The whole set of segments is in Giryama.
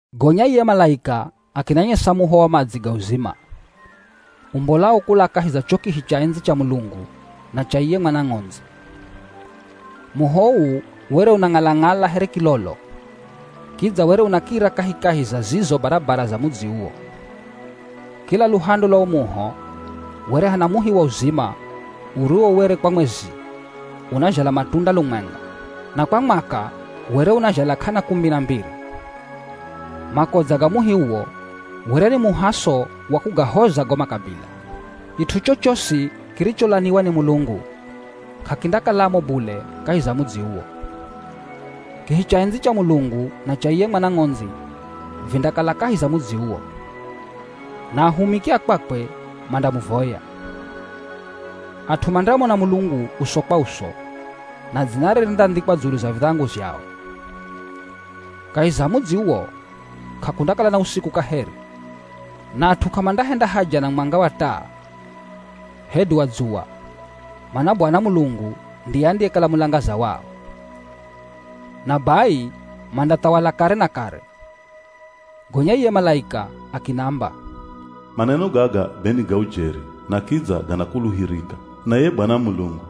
Gonya ye malaika akinanyesa muho wa madzi ga uzima, umbolao kula kahi za cho kihi cha endzi cha Mulungu na cha iye Mwana Ng'ondzi. Muho uu were unang'ala-ng'ala here kilolo. Kidza were unakira kahikahi za zizo barabara za mudzi uwo. Kila luhande lwa wo muho were hana muhi wa uzima uriwo were kwa mwezi, unazhala matunda lumwenga, na kwa mwaka were unazhala k'ana kumi na mbiri. Makodza ga muhi uwo were ni muhaso wa kugahoza go makabila. Kit'u chochosi kiricholaniwa ni Mulungu, k'akindakalamo bule kahi za mudzi uwo. Kihi cha endzi cha Mulungu na cha iye Mwana Ng'ondzi vindakala kahi za mudzi uwo. Na ahumiki a kwakwe mandamuvoya. At'u mandamona Mulungu uso kwa uso na dzinare rindandhikwa dzulu za vidhangu zhao. Kahi za mudzi uwo, k'akundakala na usiku kaheri, na at'u k'amandahenda haja na mwanga wa taa hedu wa dzuwa, mana Bwana Mulungu ndiye andiyekala mulangaza wao. Na bai mandathawala kare na kare. Gonya iye malaika akinamba, “Maneno gaga be ni ga ujeri na kidza ganakuluhirika. Na iye Bwana, Mulungu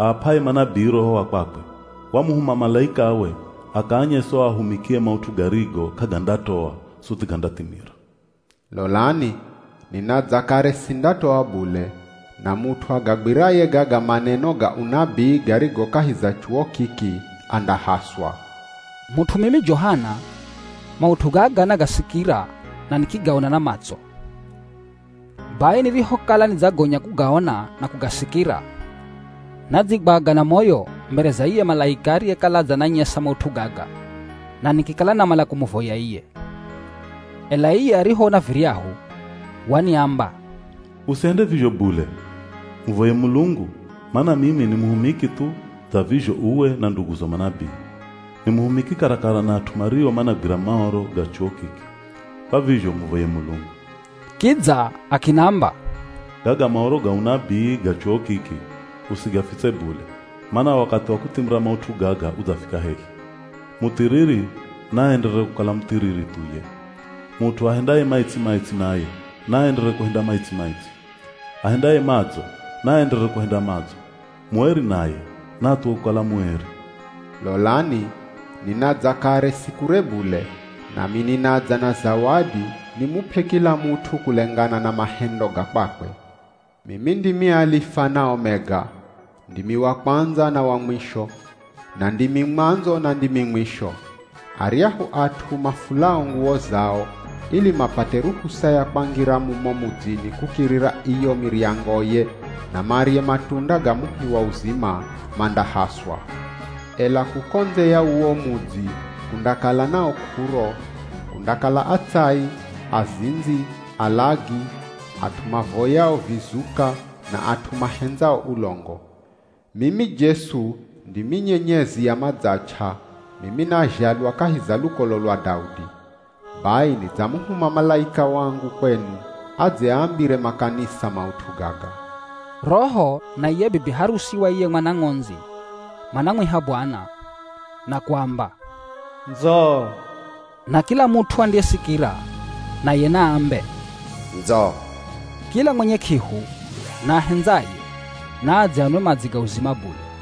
aap'aye manabii Roho wa kwakwe, wamuhuma malaikawe akaanyese o ahumikie maut'u garigo k'agandatoa suthi gandathimira.” “Lolani, ninadza kare sindatoa bule, na mut'u agagwiraye gaga maneno ga unabii garigo kahi za chuwo kiki, andahaswa.” Mut'u mimi Johana, maut'u gaga nagasikira na nikigaona na matso. Bai nirihokala nidzagonya kugaona na kugasikira, nadzigwaga na moyo mbere za iye malaika ariyekala adzananyesa maut'u gaga na nikikala namala kumuvoya iye. Ela iye arihoona viryahu, waniamba, “Usihende vizho bule! Muvoye Mulungu, mana mimi ni muhumiki thu dza vizho uwe na nduguzo manabii. Ni muhumiki karakara na at'u mario managwira Maoro ga chuwo kiki, kwa vizho muvoye Mulungu.” Kidza akinamba, “Gaga Maoro ga unabii ga chuwo kiki, usigafitse bule, mana wakathi wa kuthimira maut'u gaga udzafika hehi. Muthiriri, naaenderere kukala muthiriri thuye. Mut'u ahendaye maitsi-maitsi naye naaenderere kuhenda maitsi-maitsi. Ahendaye madzo naaenderere kuhenda madzo. Mueri naye naathuwe kukala mueri.” “Lolani, ninadza kare si kure bule, nami ninadza na zawadi nimup'e kila mut'u kulengana na mahendo ga kwakwe. Mimi ndimi Alifa na Omega. Ndimi wa Kwandza na wa Mwisho. Na ndimi Mwandzo na ndimi Mwisho. “Aryahu at'u mafulao nguwo zao, ili mapate ruhusa ya kwangira mumo mudzini kukirira iyo miryangoye na marye matunda ga muhi wa uzima, mandahaswa. Ela kuko ndze ya uwo mudzi kundakala na o k'uro, kundakala atsai, azindzi, alagi, at'u mavoyao vizuka na at'u mahendzao ulongo. Mimi Jesu, ndimi nyenyezi ya madzach'a, mimi nazhalwa kahi za lukolo lwa Daudi. Bai nidzamuhuma malaika wangu kwenu adze aambire makanisa maut'u gaga.” Roho na iye Bibi harusi wa iye Mwana Ng'ondzi manamwiha Bwana, na kuamba, “Ndzo.” Na kila mut'u andiyesikira, naye naambe, “Ndzo.” Kila mwenye k'ihu na ahendzaye, naadze anwe madzi ga uzima bule.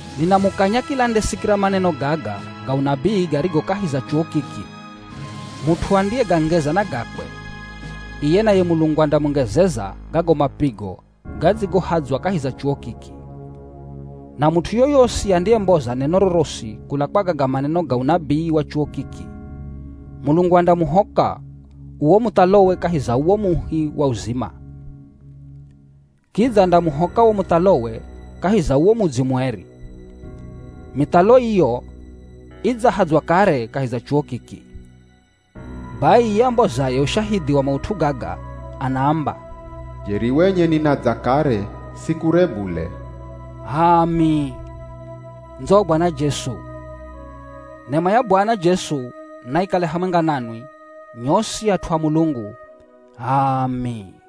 Ninamukanya kila andesikira maneno gaga ga unabii garigo kahi za chuwo kiki: Mut'u andiyegangeza na gakwe, iye naye Mulungu andamungezeza gago mapigo gadzigohadzwa kahi za chuwo kiki. Na mut'u yoyosi andiyemboza neno rorosi kula kwa gaga maneno ga unabii wa chuwo kiki, Mulungu andamuhoka uwo muthalowe kahi za uwo muhi wa uzima. Kidza andamuhoka wo muthalowe kahi za uwo mudzi mueri. Mithalo iyo idzahadzwa kare kahi za chuwo kiki. Bai iye ambozaye ushahidhi wa maut'u gaga anaamba, “Jeri wenye ninadza kare si kure bule.” H'aami, ndzo Bwana Jesu! Nema ya Bwana Jesu naikale hamwenga nanwi nyosi at'u a Mulungu. H'aami.